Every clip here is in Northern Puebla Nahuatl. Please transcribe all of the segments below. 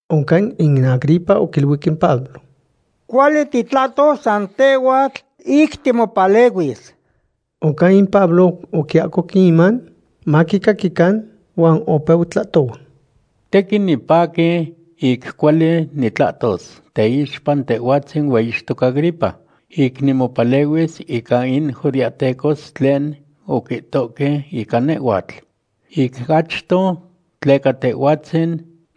Oncan in Agripa oquiluic in Pablo: ―Cuali titlahtos san tehhuatl ic timopalehuis. Oncan in Pablo oquiahcoc in iman maquicaquican, huan opeu tlahtohua: ―Tequin nipaqui ic cuali nitlahtos teixpa tehhuatzin hueyixtoc Agripa, ic nimopalehuis ica in judeahtecos tlen oquihtohque ica nehhuatl. Ic achto tleca tehhuatzin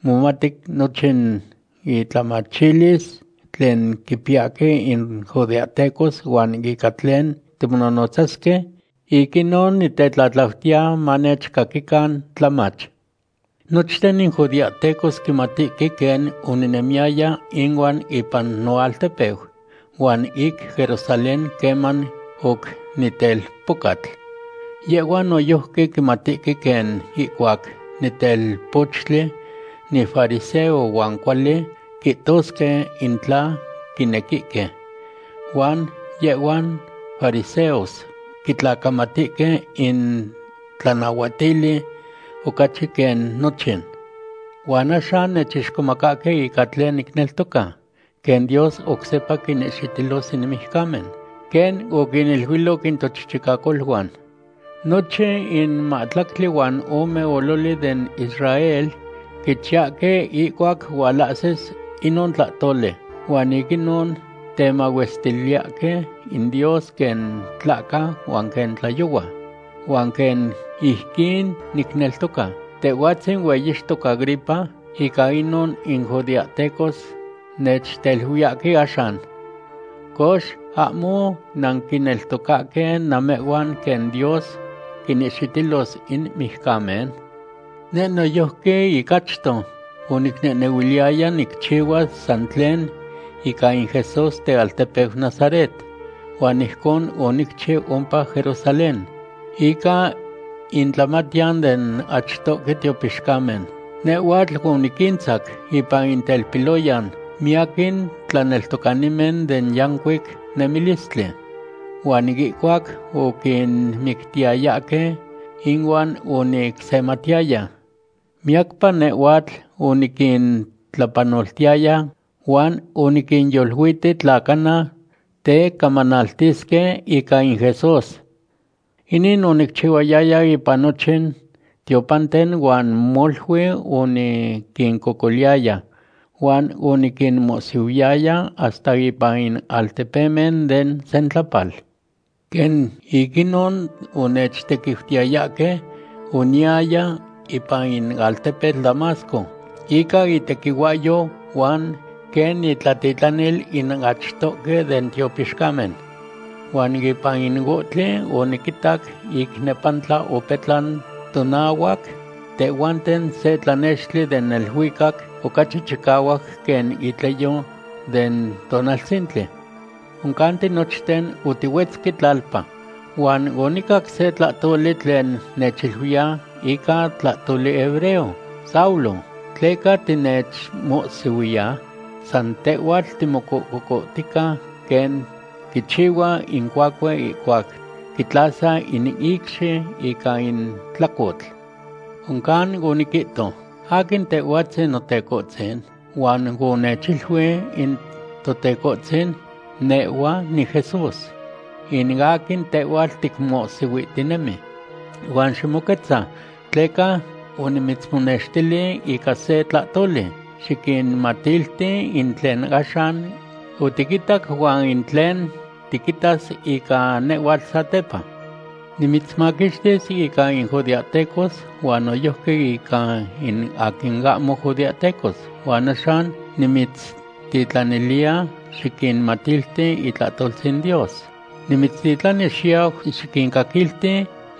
momati nochin intlamachilis tlen quipiyahque in judeahtecos huan ica tlen timonohnotzasque. Ic inon nitetlatlautiya manechcaquican tlamach. ’Nochten in judeahtecos quimatihque quen oninemiyaya inuan ipan noaltepeu huan ic Jerusalén queman oc nitelpocatl. Yehhuan noyojqui quimatihque quen ihcuac nitelpochtli nifariseo huan cuali quihtosque in tla quinequihque. Huan yehhuan fariseos quitlacamatihque in tlanahuatili ocachi quen nochin. Huan axan nechixcomacahque ica tlen nicneltoca, quen Dios oc sepa quinihxitilos in mijcamen quen oquiniluiloc in tochichicacoluan. Nochin in mahtlactli huan ome ololi den Israel quichiyahque ihcuac hualahsis inon tlahtoli, huan ic inon temahuestiliyahque in Dios quen tlahca huan quen tlayohua. Huan quen ijquin nicneltoca, tehhuatzin hueyixtoc Agripa, ica inon in judeahtecos nechteluiyahque axan. Cox, ¿ahmo nanquineltocahque namehhuan quen Dios quinihxitilos in mijcamen? ’Neh noyojqui ic achto onicnehnehuiliyaya nicchihuas san tlen ica in Jesús tealtepeu Nazaret. Huan ijcon onicchiu ompa Jerusalén. Ica intlamatiyan den achtohque tiopixcamen nehhuatl oniquintzacu ipan in telpiloyan miyaquin tlaneltocanimen den yancuic nemilistli. Huan ihcuac oquinmictiyayahque, inuan onicsematiyaya. Miyacpa nehhuatl oniquintlapanoltiyaya huan oniquinyoluiti tla cana tecamanaltisque ica in Jesús. Inin onicchihuayaya ipan nochin tiopanten huan molui oniquincocoliyaya, huan oniquinmohsihuiyaya hasta ipan in altepemen den sentlapal. ’Quen ic inon onechtequiutiyayahque, oniyaya ipan in altepetl Damasco ica itequihuahyo huan quen nitlatitlanil in achtohque den tiopixcamen. Huan ipan in ohtli, oniquitac ic nepantla opetlan tonahuac tehhuanten se tlanextli den neluicac ocachi chicahuac quen itleyo den tonaltzintli. Oncan tinochten otihuetzque tlalpa, huan onicac se tlahtoli tlen nechiluiya ica tlahtoli hebreo: “Saulo, ¿tleca tinechmohsihuiya? San tehhuatl timocococohtica, quen quichihua in cuacue ihcuac quitlasa in icxi ica in tlacotl.” Oncan oniquihto: “¿Aquin Tehhuatzin, Notecohtzin?” Huan onechiluic in Totecohtzin: “Nehhua niJesús, in aquin tehhuatl ticmohsihuihtinemi. Huan ximoquetza, tleca onimitzmonextili ica se tlahtoli. Xiquinmatilti in tlen axan otiquitac huan in tlen tiquitas ica nehhuatl satepa. Nimitzmaquixtis ica in judeahtecos huan noyojqui ica in aquin ahmo judeahtecos. Huan axan nimitztitlaniliya xiquinmatilti itlahtoltzin Dios. Nimitztitlani xiyau xiquincaquilti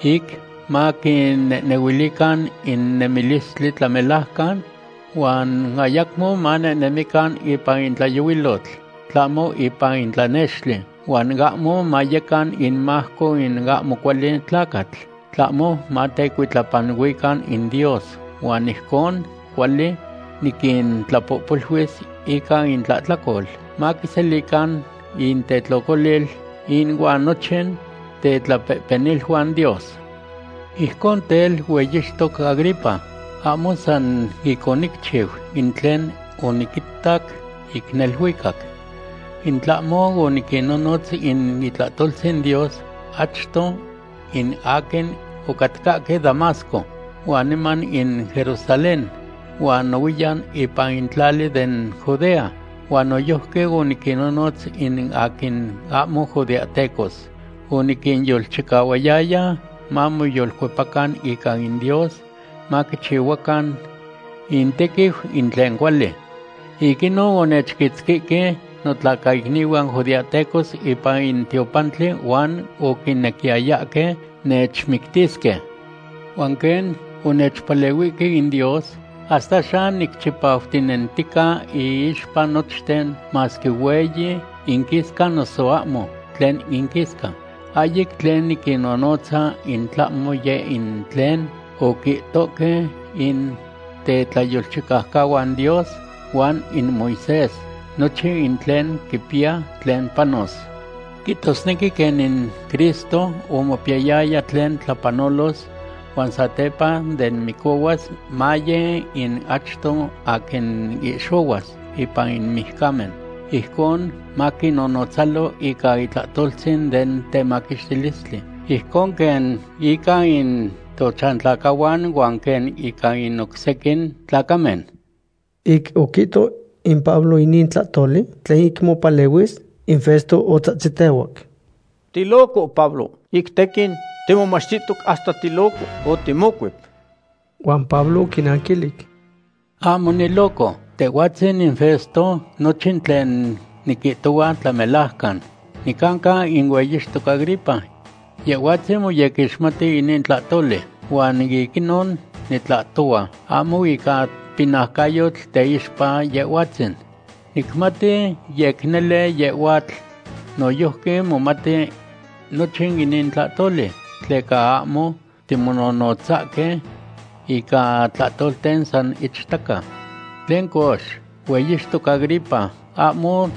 ic maquinehnehuilican in nemilistli tlamelajcan huan ayacmo manehnemican ipan in tlayohuilotl, tlahmo ipan in tlanextli. Huan ahmo mayecan imajco in ahmo cuali tlacatl, tlahmo matecuitlapanuican in Dios. Huan ijcon cuali niquintlapohpoluis ica intlahtlacol maquiselican intetlocolil inuan nochin tetlapehpeniluan Dios.” ’Ijcon tel, hueyixtoc Agripa, ahmo san ic onicchiu in tlen oniquitac ic neluicac. In tlahmo oniquinnonotz in itlahtoltzin Dios achto in aquin ocatcahque Damasco, huan niman in Jerusalén, huan nohuiyan ipan tlali den Judea. Huan noyojqui oniquinnonotz in aquin ahmo judeahtecos. Oniquinyolchicahuayaya mamoyolcuepacan ica in Dios, maquichihuacan intequiu in tlen cuali. Ic inon onechquitzquihque notlacaicnihuan judeahtecos ipan in tiopantli huan oquinequiyayahque nechmictisque. Huan quen onechpalehuihque in Dios, hasta axan nicchipautinentica iixpa nochten, masque hueyi inquisca noso ahmo tlen inquisca. Ahyic tlen niquinnonotza in tlahmo yeh in tlen oquihtohque in tetlayolchicaucahuan Dios huan in Moisés, nochin in tlen quipiya tlen panos. Quihtosnequi quen in Cristo omopiyayaya tlen tlapanolos huan satepa de micohuas maye in achto aquin ihxohuas ipan in mijcamen. Ijcon maquinnonotzalo ica itlahtoltzin den temaquixtilistli, ijcon quen ica in tochantlacahuan huan quen ica in oc sequin tlacamen. Ic oquihto in Pablo inin tlahtoli tlen ic mopalehuis, in Festo otzahtzitehuac: ―¡Tiloco Pablo! Ic tequin timomachtihtoc hasta tiloco otimocuep. Huan Pablo oquinanquilic: ―Ahmo niloco, tehhuatzin in Festo. Nochin tlen niquihtohua tlamelajcan. Nicanca in hueyixtoc Agripa. Yehhuatzin moyequixmati inin tlahtoli. Huan ic inon nitlahtohua ahmo ica pinaucayotl teixpa yehhuatzin. Nicmati yec nele yehhuatl noyojqui momati nochin inin tlahtoli, tleca ahmo timonohnotzahque ica tlahtolten san ichtaca. ¿Tlen cox, hueyixtoc Agripa, ahmo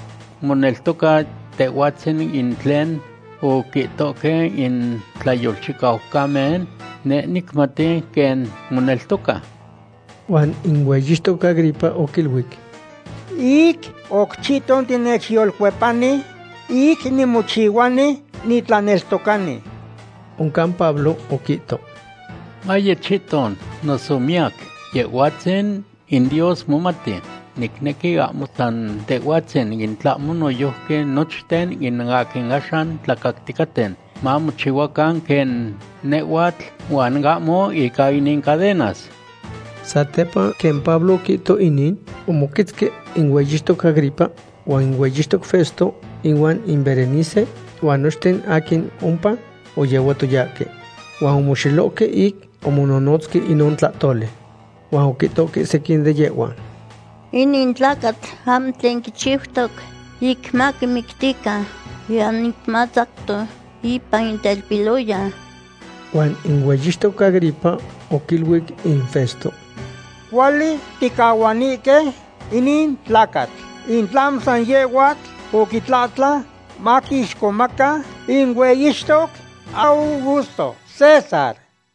moneltoca tehhuatzin in tlen oquihtohque in tlayolchicaucamen? Neh nicmati quen moneltoca. Huan in hueyixtoc Agripa oquiluic: ―Ic oc chihton tinechyolcuepani ic nimochihuani nitlaneltocani. Oncan Pablo oquihto: ―Maye chihton noso miyac, Yehhuatzin in Dios momati. Nicnequi ahmo san tehhuatzin, in tlahmo noyojqui nochten in aquin axan tlacacticaten, mamochihuacan quen nehhuatl, huan ahmo ica inin cadenas. Satepa quen Pablo oquihto inin, omoquetzque in hueyixtoc Agripa huan in hueyixtoc Festo inuan in Berenice huan nochten aquin ompa oyehuatoyahque. Huan omoxelohque ic omononotzque inon tlahtoli. Huan oquihtohque sequin de yehhuan: ―Inin tlacatl ahmo tlen quichiutoc ic maquimictican, niyan ic matzacto ipan in telpiloyan. Huan in hueyixtoc Agripa oquiluic in Festo: ―Cuali ticahuanihque inin tlacatl in tlahmo san yehhuatl oquitlahtlan maquixcomaca in hueyixtoc Augusto César.